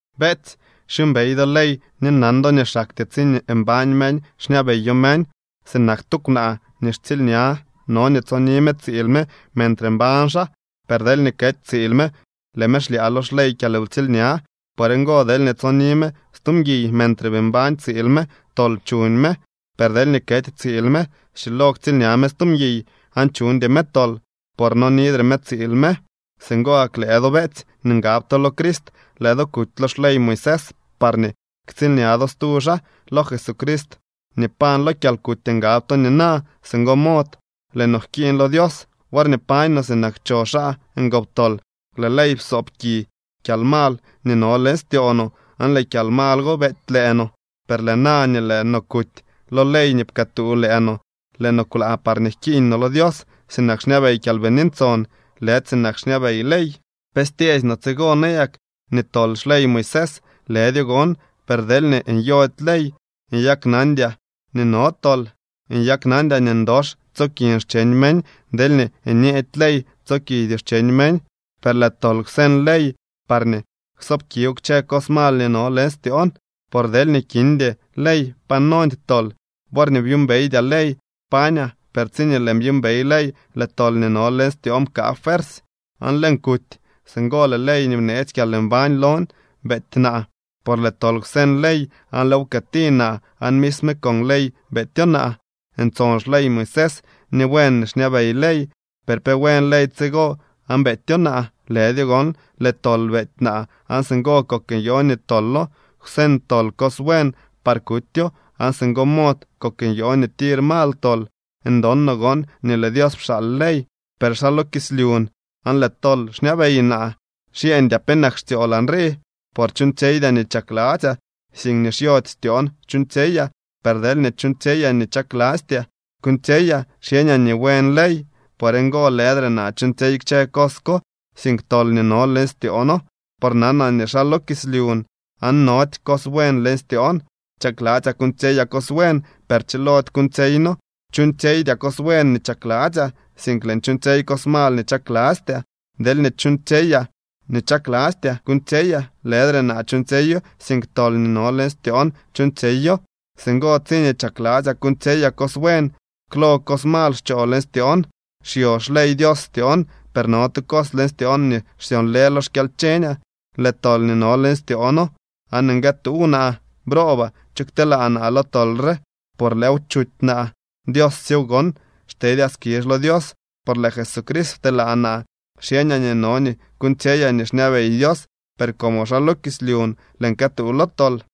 Beetsy, xyuumbey do ley ni nan do nii xaktyee tsiñee mbañ meñ xñabeyo meñ. Sinak tu kwnaa nii xtsiilña, no nii tsoni me tsiil me mentre mbañ xaa, per deelñee kety tsiil me, lëë me xlyaa lo xley kyalwtsiilña. Por ngo, deelñee tsoni me stu mguiy mentre bii mbañ tsiil me, tol chuñ me. Per deelñee kety tsiil me, schilo ktsiilña me stu mguiy aan chuñdy me tol, por nonidre me tsiil me. Singo gak lëë do, beetsy, nii ngab to lo Crist, lëë do kuty lo xley Moisés parñee ktsiilña do stu xaa. Lo Jesucrist nii pañ lo kyalkuty ngab to nina. Singo mod lëë no jkiiñ lo Dios. Worñee pañ no sinak cho xaa ngoptol, lëë ley psoob ki kyalmal nii no leñ styoo no aan lëë kyalmal go beety lëë no. Per lëë na nii lëë no kuty lo ley nii pkëëtuu lëë no, lëë no kwlaa parñee jkiiñ no lo Dios sinak xñabey Kyalbini Ntson, lëdy sinak xñabey ley. ¿Pe styeesy no tsigo nayak, nii tol xley Moisés? ¡Lëdyo gon! Per deelñee nyody ley, nyaknandyaa nii no tol. Nyaknandyaa nii ndox tsokin xcheñ meñ deelñee nyeedy ley: “Tso kidyoo xcheñ meñ.” Per lëë tol kwseñ ley parñee ksoobkiw kchë cos mal nii no leñ styoon. Por deelñee kindy ley, pa nondy tol. Worñee byuumbeydyaa ley, pañaa. Per tsiñee lëën byuumbey ley, lëë tol nii no leñ styoon pkaa fuersy aan lëën kuty. Singo lëë ley nii bneetsy kyalmbañ lon beety naa. Por lëë tol kwseñ ley aan lëëw pkëëti naa aan misme con ley beetyo naa. Ntson xley Moisés, ni buen nii xñabey ley. ¿Per pe buen ley tsigo aan beetyo naa? ¡Lëdyo gon! Lëë tol beety naa aan singo kok nyoo nii tolo. Kwseñ tol cos buen par kutyo, aan singo mod kok nyoo nii tir mal tol. Ndon no gon nii lëë Dios pxaal ley, per xaa lo kislyun aan lëë tol xñabey naa. Xyeñdyaa penak xtsyolaa nrii. Por chuuñtsyeydyaa nii chakladzyaa, sink nii xyody styoon chuuñtsyeyaa. Per deelñee chuuñtsyeyaa nii chaklastyaa kuuñtsyeyaa, xyeñaa nii buen ley. Por ngo lëdre naa chuuñtsyey kchë cos ko, sink tol nii no leñ styoono. Por nanaa nii xaa lo kislyun aan nody cos buen leñ styoon. Chakladzyaa kuuñtsyeyaa cos buen, per chilody kuuñtsyeyno. Chuuñtsyeydyaa cos buen nii chakladzyaa, sink lëën chuuñtsyey cos mal nii chaklastyaa. Deelñee chuuñtsyeyaa nii chaklastyaa kuuñtsyeyaa, lëdre naa chuuñtsyeyo, sink tol nii no leñ styoon chuuñtsyeyo. Singo tsiñee chakladzyaa kuuñtsyeyaa cos buen, klol cos mal xchoo leñ styoon. Xyo xley Dios styoon, per no tu cos leñ styoon nii xsyonlë lo xkyalcheñaa. Lëë tol nii no leñ styoono aan nguëtuuw naa. ¡Broobaa! ¿Cho kteelaa naa lo tol re? Por lëëw chuty naa. ¡Dios syew gon! Xtedyaa skizh lo Dios, por lëë Jesucrist pteelaa naa. Xyeñaa nii no nii kuuñtsyeyaa nii xñabey Dios, per como xaa lo kislyun, lëën këtuu lo tol.